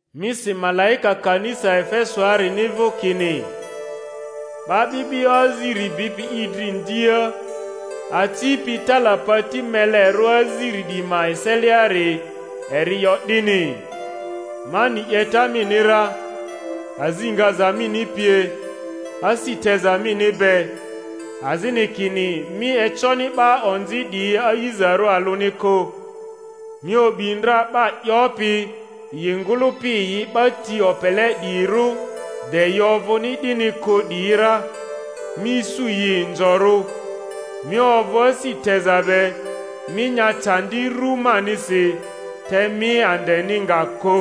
Mi si malaika kanisa Efesoarini vᴜ kini: 'Ba 'bi'bio aziri bipi i dri ndia, acipi talapati melerᴜ aziri 'diyi ma eseliari, eri 'yo 'dini: Ma ni 'yeta mini ra, azi ngaza mini pie, asi teza mini be, azini kini mi econi 'ba onzi 'diyi a'izarᴜ alᴜni kᴜ, mi o'bi ndra 'ba 'yopi yi ngᴜlᴜpi yi 'ba ti opele 'diyirᴜ de yi ovᴜni 'dini kᴜ 'diyi ra, mi isu yi inzorᴜ; mi ovᴜ asi teza be, mi nya candi ru manisi, te mi andeni nga kᴜ.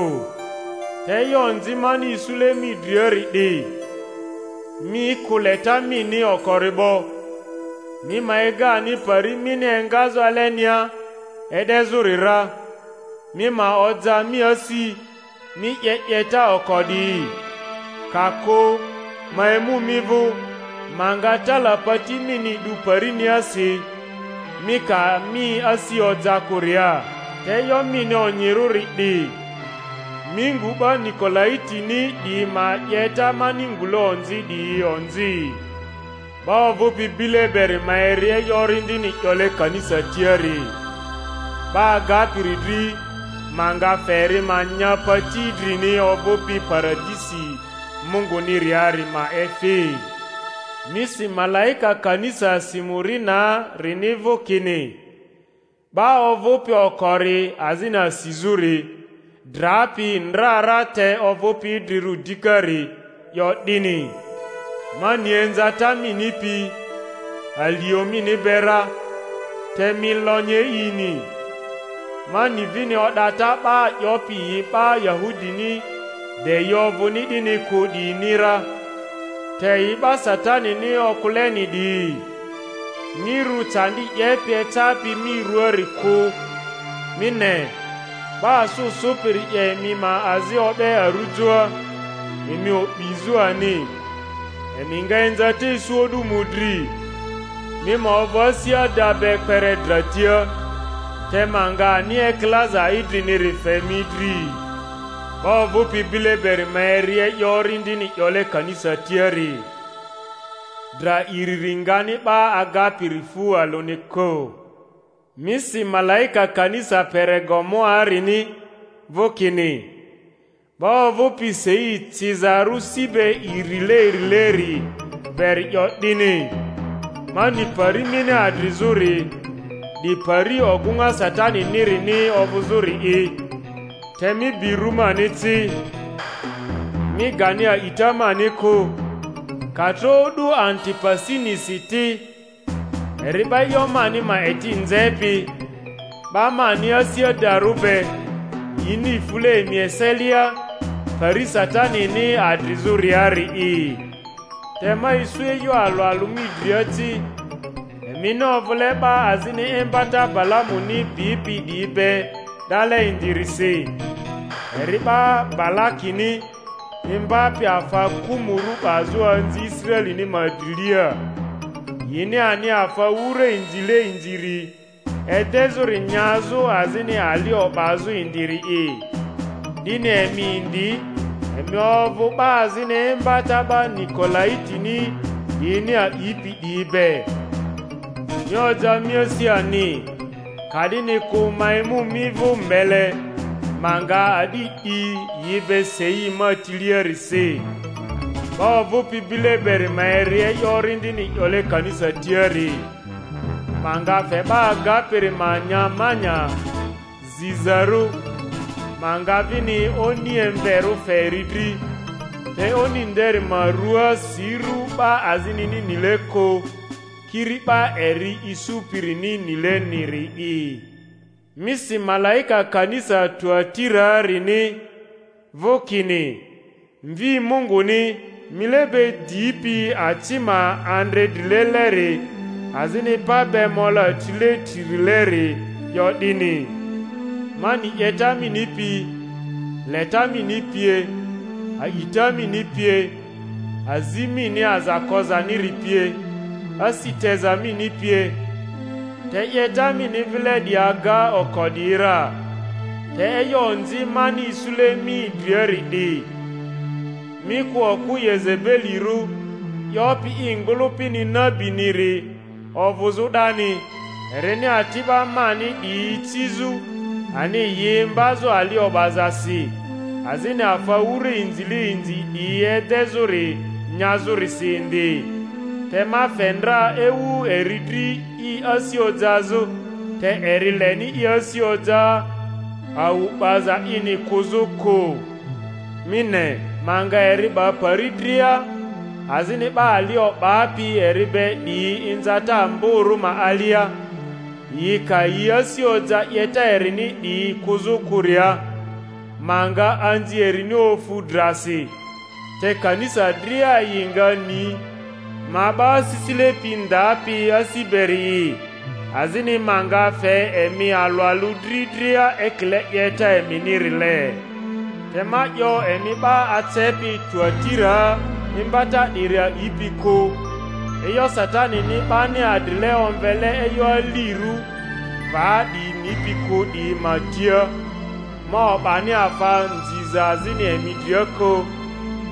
Te e'yo onzi mani isule mi driari 'di, mi kᴜ leta mini okori 'bo. Mi ma ega ani pari mini engazᴜ alenia e'dezᴜri ra, mi ma oja mi asi, mi 'ye 'yeta oko 'diyi. Ka kᴜ ma emu mi vᴜ, ma nga talapati mini 'du pari-niasi, mi ka mi asi oja kᴜria. Te e'yo mini onyirᴜri 'di, mi ngu 'ba Nikolaitini 'diyi ma 'yeta mani ngule onzi 'diyi onzi. 'Ba ovᴜpi bile beri ma eri e'yo Orindini 'yole kanisa tiari. 'Ba agapiri dri, ma nga fe eri ma nya pati idrini ovᴜpi Paradisi Munguniriari ma efi. Mi si malaika kanisa Simurinaa-rini vᴜ kini: 'Ba ovᴜpi okori azini asizᴜri, drapi ndra ra te ovᴜpi idrirᴜ dikari, 'yo 'dini: Ma ni inzata mini pi, alio mini be ra (te mi lonyi e'ini), ma ni vini o'data 'ba 'yopi yi 'ba Yahudini de yi ovᴜni 'dini kᴜ 'diyini ra, te yi 'ba Satanini okᴜleni 'diyi. Mi rᴜ candi 'yepi eccapi mi ruaari kᴜ. Mi ne, 'ba asᴜ sᴜpiri 'ye emi ma azi o'be arujoa, emi o'bizᴜ ani; emi nga inzata isu o'du mᴜdri. Mi ma ovᴜ asi ada be kpere dra tia, te ma nga ani ekilaza idriniri fe mi dri. 'Ba ovᴜpi bile beri ma eri e'yo Orindini 'yole kanisa tiari. Dra iriri ngani 'ba agapiri fu alᴜni kᴜ. Mi si malaika kanisa Peregamoarini vᴜ kini: 'Ba ovᴜpi sei cizarᴜ si be irileirileri beri 'yo 'dini: Ma ni pari mini adrizᴜri, 'di pari ogᴜŋa Sataninirini ovᴜzᴜri'i; te mi bi rᴜ mani ci, mi gani a'ita mani kᴜ, ka tro o'du Antipasinisi ti, eri 'ba e'yo mani ma eti nzepi, 'ba mani asi adarᴜ be, yini fule emi eselia, pari Satanini adrizᴜriari'i. Te ma isu e'yo alᴜ alᴜ mi dria ci: emini ovᴜle 'ba azini imbata Balamuni bipi 'diyi be 'dale indirisi; eri 'ba Balakini imbapi afa kᴜmᴜrᴜ 'bazᴜ anzi Israelini ma drilia, yini ani afa wura inzile inziri edezᴜri nyazᴜ azini ali o'bazᴜ indiri’i. 'Dini emi indi emi ovᴜ 'ba azini imbata 'ba Nikolaitini 'diyini a'ipi 'diyi be. Mi oja mi asi ani. Ka'dini kᴜ ma emu mi vᴜ mbele, ma nga a'di 'di yi be sei ma tiliarisi. 'Ba ovᴜpi bile beri ma eri e'yo Orindini 'yole kanisa tiari. Ma nga fe 'ba agapiri ma nya mana zizarᴜ, ma nga vini oni emverᴜ fe eri dri, te oni nderi ma ruaa si ru 'ba azinini nile kᴜ, kiri 'ba eri isupirini nileniri'i. Mi si malaika kanisa Tuatiraarini vᴜ kini: Mvi Munguni, mile be dipi aci ma andre drileleri, azini pa be mola trile tririleri, 'yo 'dini: Ma ni 'yeta mini pi, leta mini pie, a'ita mini pie, azi mini aza kozaniri pie, asi teza mini pie, te 'yeta mini vile 'diyi aga oko 'diyi ra. Te e'yo onzi mani isule mi driari 'di, mi kᴜ okᴜ Yezebelirᴜ, 'yopi i ngᴜlᴜpini nabiniri ovᴜzᴜ 'dani, erini ati'ba mani 'diyi icizᴜ ani yi imbazᴜ ali o'bazasi, azini afa wura inzile inzi 'diyi edezᴜri nyazᴜrisi indi. Te ma fe ndra ewu eri dri i asi ojazᴜ, te eri leni i asi oja awu 'baza ini kᴜzu kᴜ. Mi ne, ma nga eri 'ba pari dria, azini 'ba ali o'bapi eri be 'diyi inzata amborᴜ ma alia, yi ka yi asi oja 'yeta erini 'diyi kᴜzᴜ kᴜria; ma nga anzi erini ofu drasi. Te kanisa dria yi nga ni ma 'ba asisile pi ndapi asi beri'i, azini ma nga fe emi alᴜ alᴜ dri dria ekile 'yeta eminirile. Te ma 'yo emi 'ba acepi Tuatiraa, imbata 'diri a'ipi kᴜ, e'yo Satanini 'bani adrile omvele e'yo alirᴜ va 'diyi nipi kᴜ 'diyi ma tia: ma o'bani afa nziza azini emi dria kᴜ;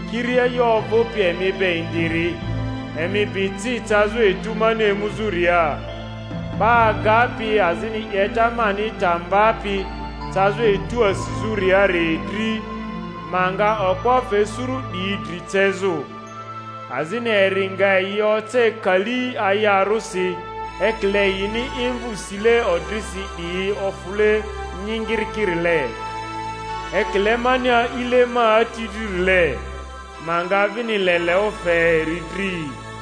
kiri e'yo ovᴜpi emi be indiri, emi bi ci cazᴜ etu mani emuzᴜria. 'Ba agapi azini 'yeta mani ta mbapi cazᴜ etu asizᴜriari dri, ma nga okpo fe suru 'dryi dri cezᴜ, azini eri nga yi oce kali ayarᴜsi, ekile yini imvᴜ sile odrisi 'diyi ofule nyingirikirile, ekile mani a'ile ma Ati dririle; ma nga vini leleᴜ fe eri dri.